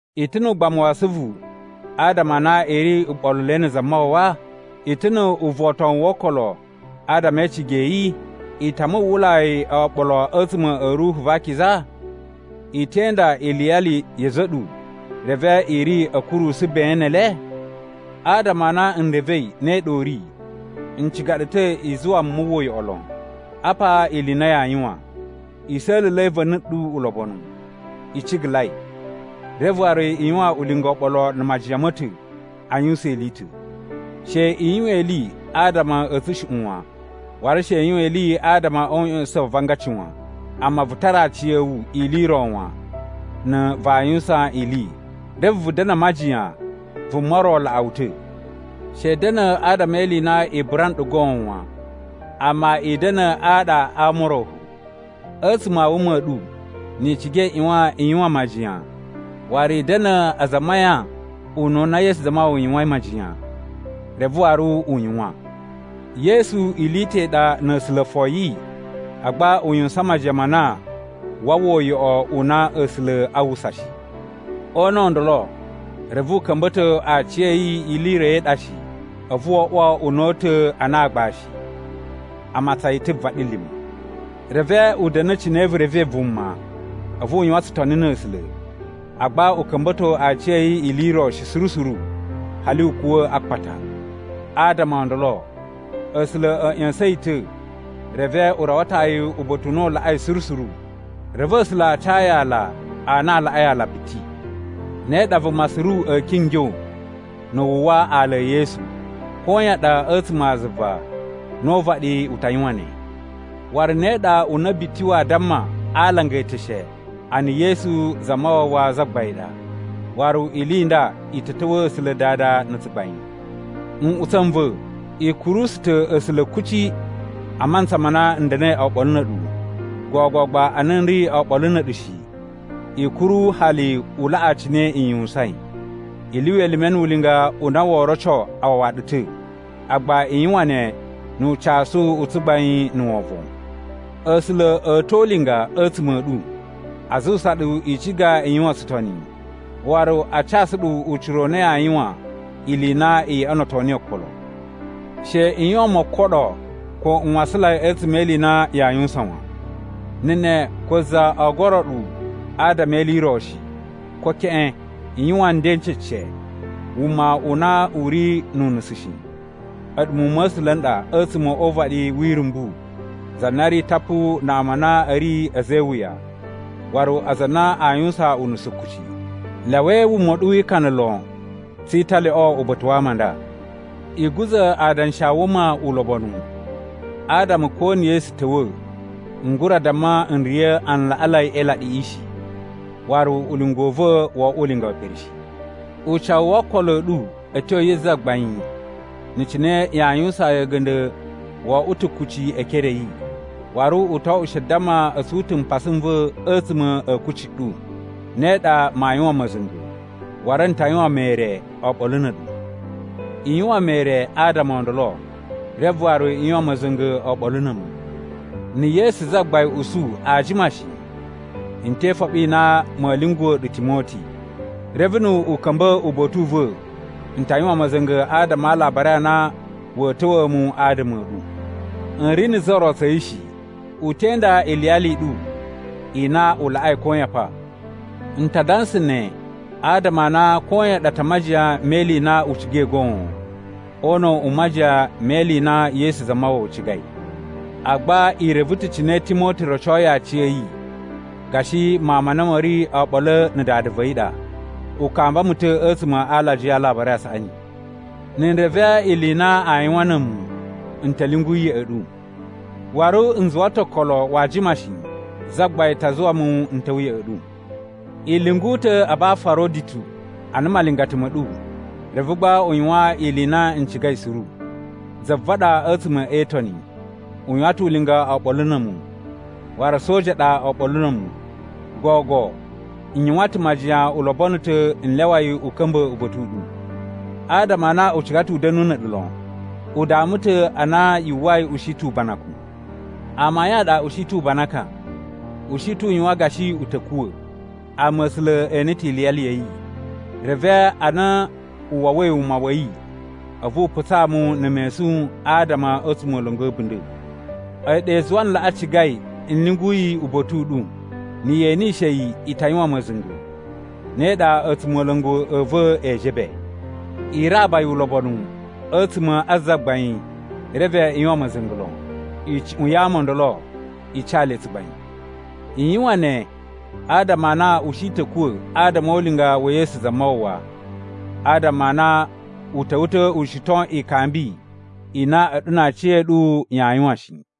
I ta̱ nu ugbamu wa asuvu adama a na i ri uɓoluloi na̱ Zamawawa? I ta̱ nu uvotowun wo okolo adama e icigi ya̱ yi? I ta muwwulai oɓolo a̱tsuma̱ a̱ Ruhu va Akiza? I te inda iliyali ya̱ a̱za̱ a̱ ɗu, reve i ri a̱ kurusu ben ne ele? Adama a na n revei ne ɗa u ri, n ciga ɗu ta̱ i zuwa mu mu uwwa uyoꞌo lon. Apa ili i na yaa yuwan: i sa̱la̱la̱i va̱ni ɗu ulobonu, i cigalai, reve waru i yuwan ulinga oɓolo na̱ majiyan ma̱ ta̱ a yuwusan ili i ta̱. She i yuwan ili adama a̱ tsushuꞌun wan, waru she i yuwan ili adama o uꞌya̱sa̱sa̱n wa avangaci wan. Amma vu tara aciya̱wu ili i ro wan na̱ vaa yuwusan ili, reve vu da̱na̱ a majiyan vuma ro laꞌa wu ta̱. She i da̱na̱ adama e ili i na i bura nɗu goon wan, amma i da̱na̱ aɗa ama o ro fo. A̱tsuma̱ a wuma a̱ ɗu ni i ciga i ꞌyuwan i yuwan majiyan waru i da̱na̱ aza a mayan ununa Yesu Zamawawa yuwain majiyan reve waru u yuwan. Yesu ili i ta̱ i ɗa na̱ A̱sula̱ foyi, agba u yuwusan majiyan ma na waa uwwa uyoꞌo u na A̱sula̱ a uwwusa shi. O una̱ u ndolo reve u ka̱mba̱to aciya̱yi ili i ro i ɗa shi, a̱vu wo oꞌwo una̱ta̱ ana aagbashi. A matsan yi ta̱ vaɗilima̱. Reve u da̱na̱ cine vu revei vuma. A̱vu u yuwan tsutoni na̱ A̱sula̱, agba u ka̱mba̱to aciya̱yi ili i ro shi suru suru, hali u kuwa̱ a akpata. Adama o ndolo, A̱sula̱ a̱ ꞌya̱sa̱n yi ta̱, reve u rawato yi uba̱ta̱ u na u laꞌai suru suru. Reve A̱sula̱ a ca yi ala a na a laꞌai ala biti. Ne ɗa vuma suru a̱a̱ kingyo na̱ wu uwwa ala e Yesu. Koyan ɗa a̱tsuma̱ a zuva na̱ o uvaɗi u ta yuwan ne. Waru ne ɗa una̱ biti waa damma a alanga eteshe a na Yesu Zamawawa Zagbain ɗa, waru ili i nda i ta̱ ta̱wa̱a̱ A̱sula̱ Dada na̱ tsugbain. Nꞌutsa̱ n va̱, i kurusu ta̱ A̱sula̱ kuci a mantsa ma na n da̱na̱i oɓolo na̱ a̱ɗu. Gogo gba a na n ri oɓolo na̱ a̱ɗu shi, i kuru hali u laꞌa cine i yuwusain. I lyuwa elime nu ulinga u na woo roco a wawa ɗu ta̱, agba i yuwan ne nu ucasu u tsugbain na̱ wovon. A̱sula̱ a̱ to ulinga a̱tsuma̱ a̱ ɗu, a zuwusa ɗu i ciga i yuwan tsutoni, waru a casu ɗu ucira u na yaa yuwan ili i na i yoꞌonoto niyi okolo. She i yuwan mokoɗo ko nwasanlai a̱tsuma̱ e ili i na yaa yuwusan wan. Na̱ ne ko za oo goro ɗu adama e ili i ro shi, ko keꞌen. I yuwan nden n cece, wuma u na u ri nu unusu shi, a̱ɗu muwun ma̱ A̱sula̱ n ɗa a̱tsuma̱ o uvaɗi wi irumbu za na ri tapu na ama a na a̱ ri a̱za̱ e iwuya waru aza a na aa yuwusan unusu kuci. Lyawai wuma u ɗu wi ikana lon tsi italyoꞌo uba̱ta̱ wa ama a nda. I guza̱ adanshi a wuma ulobonu, adama ko na̱ Yesu ta̱wa̱, n gura damma n riya̱ alaꞌanlai e ilaɗiꞌi shi, waru ulinga u va̱ wo oꞌwo ulinga we pere shi. Ucawu wo okolo a̱ ɗu a̱ tyo yi Zagbain na̱ cine yaa yuwusaan yi a̱ga̱nda̱ wo oꞌwo ta̱ kucci e ekere a̱ yi. Waru u to oꞌwo she damma a̱ tsun ta̱ mpasa n va̱ a̱tsuma̱ a̱ kucci ɗu. Ne ɗa maa yuwan ma̱za̱nga̱, waru n ta yuwan mere oɓolo na̱ a̱ɗu. I yuwan mere adama o ndolo, reve waru i yuwan ma̱za̱nga̱ oɓolo na̱ a̱mu. Na̱ Yesu Zagbain usu aa jima shi, n te ifoɓi i na ma̱a̱ lyunguwa̱ ɗu Timoti. Reve nu u ka̱mba̱ uba̱ta̱ u va̱ n ta yuwan ma̱za̱nga̱ adama a alabari a na wa̱a̱ ta̱wa̱a̱ mu adama a̱ ɗu. N ri na̱ za ro tsa̱ yi shi. U te inda iliyali i ɗu i na u laꞌai koyan pa. N ta dansa ne adama a na koyan ɗa ta majiyan me ili i na u cigai goon, o una̱ u majiyan me ili i na Yesu Zamawawa cigai. Agba i reve ta̱ cine Timoti rocoi aciya̱yi gashi mawun ma na ma̱ ri oɓolo na̱ dada va̱ yi ɗa. U kamba mu ta̱ a̱tsuma̱ a alajiya a Alabari a Saꞌani. Na̱ n reve ili i na aa yuwan na̱ a̱mu, n ta̱ lyungu yi ya̱ꞌa̱ ɗu. Waru n zuwa ta̱ okolo waa jima shi Zagbain ta zuwa mu n ta̱wa̱ ya̱ꞌa̱ ɗu. I lyungu ta̱ Abafaroditu ana malingata ma̱ ɗu, reve gba u yuwan ili i na n cigai suru. Za va̱ ɗa a̱tsuma̱ e Itoni, u yuwan ta̱ ulinga oɓolo na̱ a̱mu, waru soja ɗa oɓolo na̱ a̱mu. Gogo, n yuwan ta̱ majiyan u lobono ta̱ n lyawa yi u ka̱mba̱ uba̱ta̱ u ɗu. Adama a na u ciga ta̱ u da̱nu na̱ a̱ɗu lon. U dama ta̱ ana yu uwwai u shi ta̱ ubanakun. Amayun a ɗa u shi ta̱ u banakan, u shi ta̱ u yuwan gashi u ta̱ kuwa̱. Amma A̱sula̱ e ene ta̱ iliyali ya̱ yi, reve ana u wawai wuma wa̱ yi, a̱vu u putsa mu na̱ mesun adama a̱ a̱tsumola̱ngu a̱ a̱bunda̱. A̱yi ɗa i zuwai n laꞌa cigai n lyungu yi uba̱ta̱ u ɗu. Na̱ ye enishe yi i ta yuwan ma̱za̱nga̱, ne ɗa a̱tsumola̱ngu a̱ va̱ ee jebe. I raba yi ulobonu a̱tsuma̱ a Zagbain reve i yuwan ma̱za̱nga̱ lon. Icuꞌun ya ama o ndolo i ca le tsugbain. I yuwan ne adama a na u shi ta̱ a̱kuwa̱ adama o ulinga wa̱ Yesu Zamawawa, adama a na u ta̱wa̱ ta̱ u shiton ikambi i na a̱ɗu na aciya̱ɗu yaa yuwan shi.